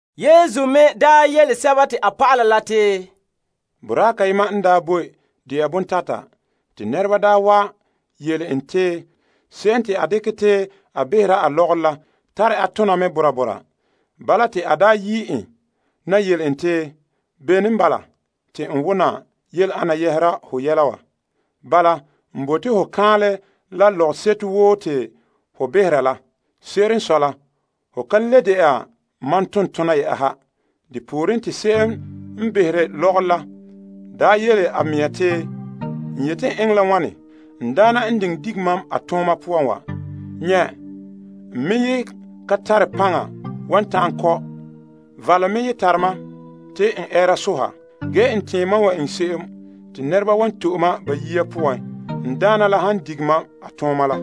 Yesu me yele a dɔlɔba la te, Boraa kayema n daa boe dɛna bontata. Te nɛreba wa yele en te se'em te a dekɛ te a behera a lɔgɔrɔ la tare a tona mɛ bora bora. Bala te a yi' en na yele en te, Bene n bala te n wona yele ana yɛhera ho yele wa? Bala, n bote ho kaanlɛ la n lɔgɔseto woo te ho behera la. Se'ere n sɔe la, ho kan le dɛna mam tontona yɛ'ɛha. Depooren te se'em n behere lɔgɔrɔ la yele a mea te, N yeti n eŋɛ la wane, n daana n diŋɛ dige mam a tooma poan wa? Nyɛ', n me ye ka tare paŋa wan ta'an kɔ'. Valom me ye tare mam te n ɛɛra soha. Ge n tɛɛn mam wan eŋɛ se'em te nɛreba wan to'e mam ba yiya poan n daana la n dige mam a tooma la.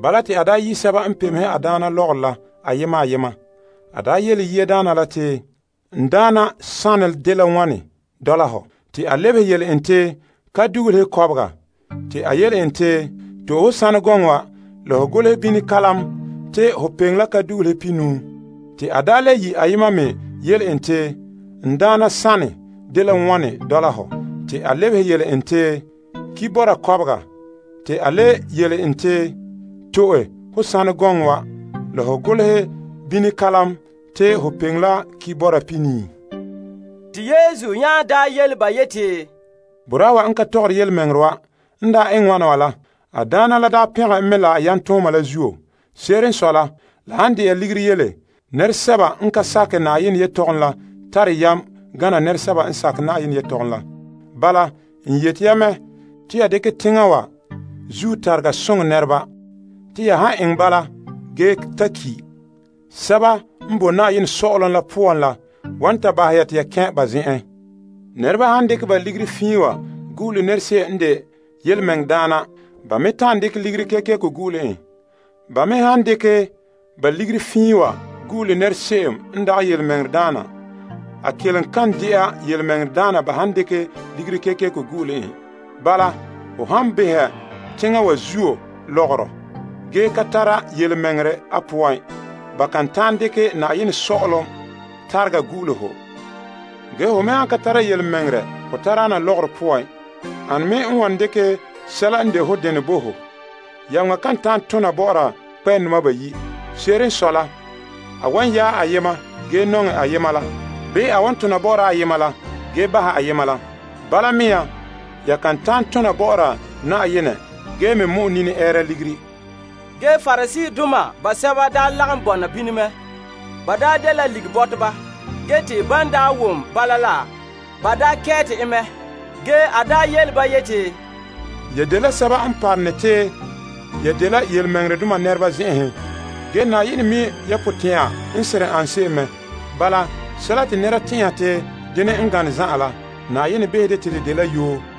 Bala te a yi' sɛba n pemehe a daana la lɔgɔrɔ la ayema ayema. A yele yiadaana la te, N daana sanɛ dela wane dɔla hɔ? Te a lebehe yele en te, Kaam dugulehe kɔbega. Te a le yele en te, To'e ho saanɛ gɔŋɔ wa la ho golehɛ bini kalam te ho peŋe la kaam dugulehe pihinuu. Te a le yi' ayema me yele en te, N daana, sanɛ dela wane dɔla hɔ? Te a lebehe yele en te, ki' bɔra kɔbega. Te a le yele en te, To'e ho saanɛ gɔŋɔ wa la ho golehɛ bini kalam te ho peŋe la ki' bɔra pihinii. Te Yesu nya yele ba yeti, Boraa wa n ka tɔgɔre yelemɛŋɛrɛ wa n eŋɛ wana wa la, a daana la pɛngɛ en mɛ la a yam tooma la zuo. Se'ere n sɔe la, la han de'a ligiri yele, nɛresɛba n ka sakɛ Na'ayenɛ yelehom la tare yam gana nɛresɛba n sakɛ Na'ayenɛ yelehom la. Bala, n yeti ya mɛ, te ya dekɛ ya teŋa wa zuo tarega soŋɛ nɛreba. Te ya han eŋɛ bala ge ta ki', sɛba n boe Na'ayenɛ Sɔ'ɔlom la poan la wan ta bahɛ ya te ya kɛn' ba zen'en. Nɛreba han dekɛ ba ligiri fiin wa gu'ule nɛra se'em n de birikina, ba me ta'an dekɛ ligiri kekeko gu'ule en. Ba me han le dekɛ ba ligiri fiin wa gu'ule nɛra se'em n dagɛ birikina, a kelom kan de'a birikina ba han dekɛ ligiri kekeko gu'ule en. Bala, ho han beha teŋa wa zuo lɔgɔrɔ ge ka tara birikina a poan, ba kan ta'an dekɛ Na'ayenɛ Sɔ'ɔlom tarega gu'ule ho. Ge ho me han ka dagana birikina la ho tadaana lɔgɔrɔ poan, ane me wan dekɛ sɛla n de ho denɛ bo ho? Yameŋa kan ta'an tona bɔ'ɔra kpɛ'ɛndoma bayi'. Se'ere n sɔe la, a wan yaɛ ayema ge nɔŋɛ ayema la, bii a wan tona bɔ'ɔra ayema la ge bahɛ ayema la. Bala mea ya kan ta'an tona bɔ'ɔra Na'ayenɛ ge me mɔ'ɛ nini ɛɛra ligiri. Ge Pariseedoma basɛba lagom bɔna bini mɛ. Ba dela ligibɔteba te ban wom bala la, ba kɛɛte en mɛ. Ge a yele ba yeti, Ya dela sɛba n parom te ya dela yelemɛŋɛrɛdoma nɛreba zen'enhen ge Na'ayenɛ mi' ya potɛn'ya. Sɛla te nɛreba tɛn'ɛha te denɛ n gane zan'an la, Na'ayenɛ behɛ de te de de'a la yoo.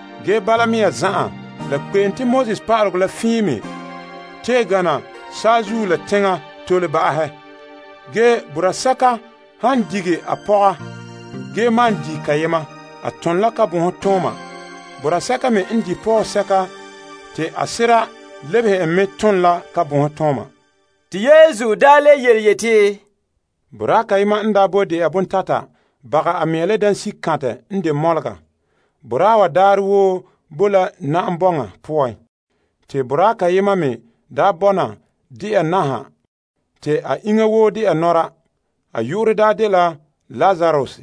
Ge bala mea zan'an, la kpe'em te Pa'alegɔ la fiin wa tee, gana saazuo la teŋa tole. Ge boraa sɛka han dige a pɔga ge malom di' kayema, a ton la kabonhe. Boraa sɛka me n di' pɔgɔsɛka te ka sera lebehe en me ton la kabonhe. Te Yesu le yeti, Boraa kayema n boe de'a bontata bagɛ a mea la dansikantɛ n de mɔlega. Boraa wa daarɛ woo bo la na'am bɔŋa poan. Te boraa kayema me bɔna de'a naha te a iŋa woo de'a nɔra. A yu'urɛ daa dela Lazarus.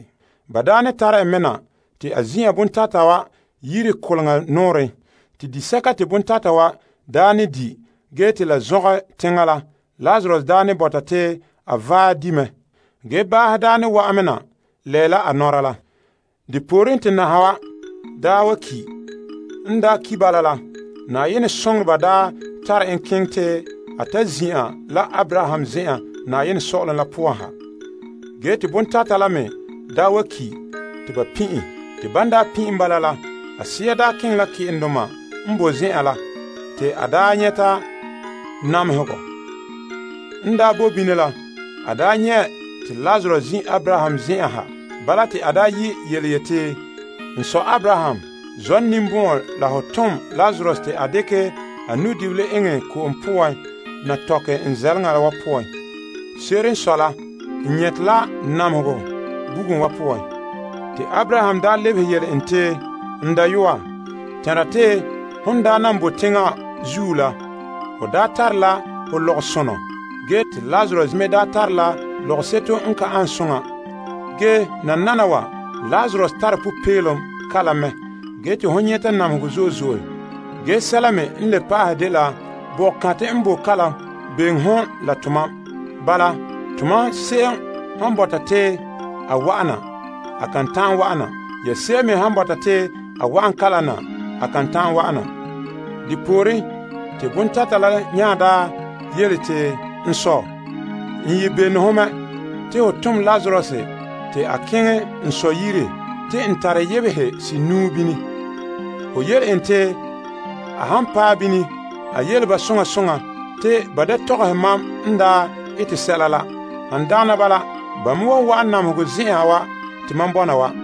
Ba daa ne tare en mɛ na te a zin'an bontata wa yire koleŋa nɔɔrɛn. Te disɛka te bontata wa ne di' ge te la zɔngɛ teŋa la, Lazarus ne bɔta te a vaɛ di' mɛ. Ge, baahe ne wa'an me na lɛɛla a nɔra la. Depooren, te naha wa wa ki'. N daa ki' bala la, Na'ayenɛ soŋoreba daa tare en keŋɛ te a ta zin'an la Abraham zen'en Na'ayenɛ Sɔ'ɔlom la poan ha. Ge te bontata la me wa ki' te ba pin' en. Te ban daa pin' en bala la, a sea keŋɛ la ke'endoma n boe zen'en la te a daa nyɛta namehegɔ. N bo bini la, a nyɛ' te Lazarus zin' Abraham zen'en ha. Bala te a yi' yeti, n sɔ Abraham, zɔ' n ninbɔn'ɔn la ho tom Lazarus te a ta dekɛ a nu'dibila eŋɛ ko'om poan na tɔkɛ n zɛleŋa wa poan. Se'ere n sɔe la, n nyɛte la namehegɔ bugum wa poan. Ge Abraham lebehe yele en te, n dayɔa, tɛnra te hon nan boe teŋa zuo la, ho tare la ho lɔgɔsonɔ, ge te Lazarus me tara lɔgɔseto n ka ane soŋa. Ge nananawa, Lazarus tare popeelom kalam mɛ ge te hon nyɛta namehegɔ. Ge sɛla me n le pa'ahɛ dela boko kantɛ n boe kalam bɛŋe hon la tomam. Bala, tomam se'em han bɔta te a wa'ana, a kan ta'an wa'ana. Ya se'em me han bɔta te a wa'an kalam na, a kan ta'an wa'ana. Depooren, te bontata la nya yele te, n sɔ, n ye bene ho mɛ te ho tom Lazarus te a keŋɛ n sɔ yire. Te n tare yebehe senuu bini. Ho yele en te a han paɛ bini, a yele ba soŋa soŋa te ba ta tɔgɔhɛ mam n ete se'em la. Han dagana bala, ba me wan wa'an namehegɔ zen'en wa te mam bɔna wa.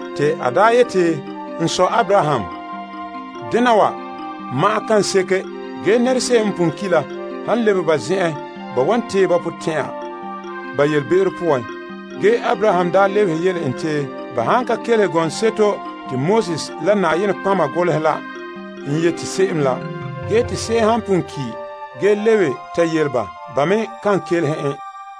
Te a yeti, N sɔ Abraham, dena wa ma'an ka seke. Ge nɛra se'em n pon ki' la han lebe ba zen'en, ba wan tee ba potɛn'ɛra ba yelebe'ero poan. Ge Abraham daa lebehe yele en te, ba han ka kelehe gɔŋseto te Moses la nɔtɔgɔheba golehɛ la n yete se'em la, ge te se'em han pon ki' ge lebe ta yele ba, ba me kan kelehe en.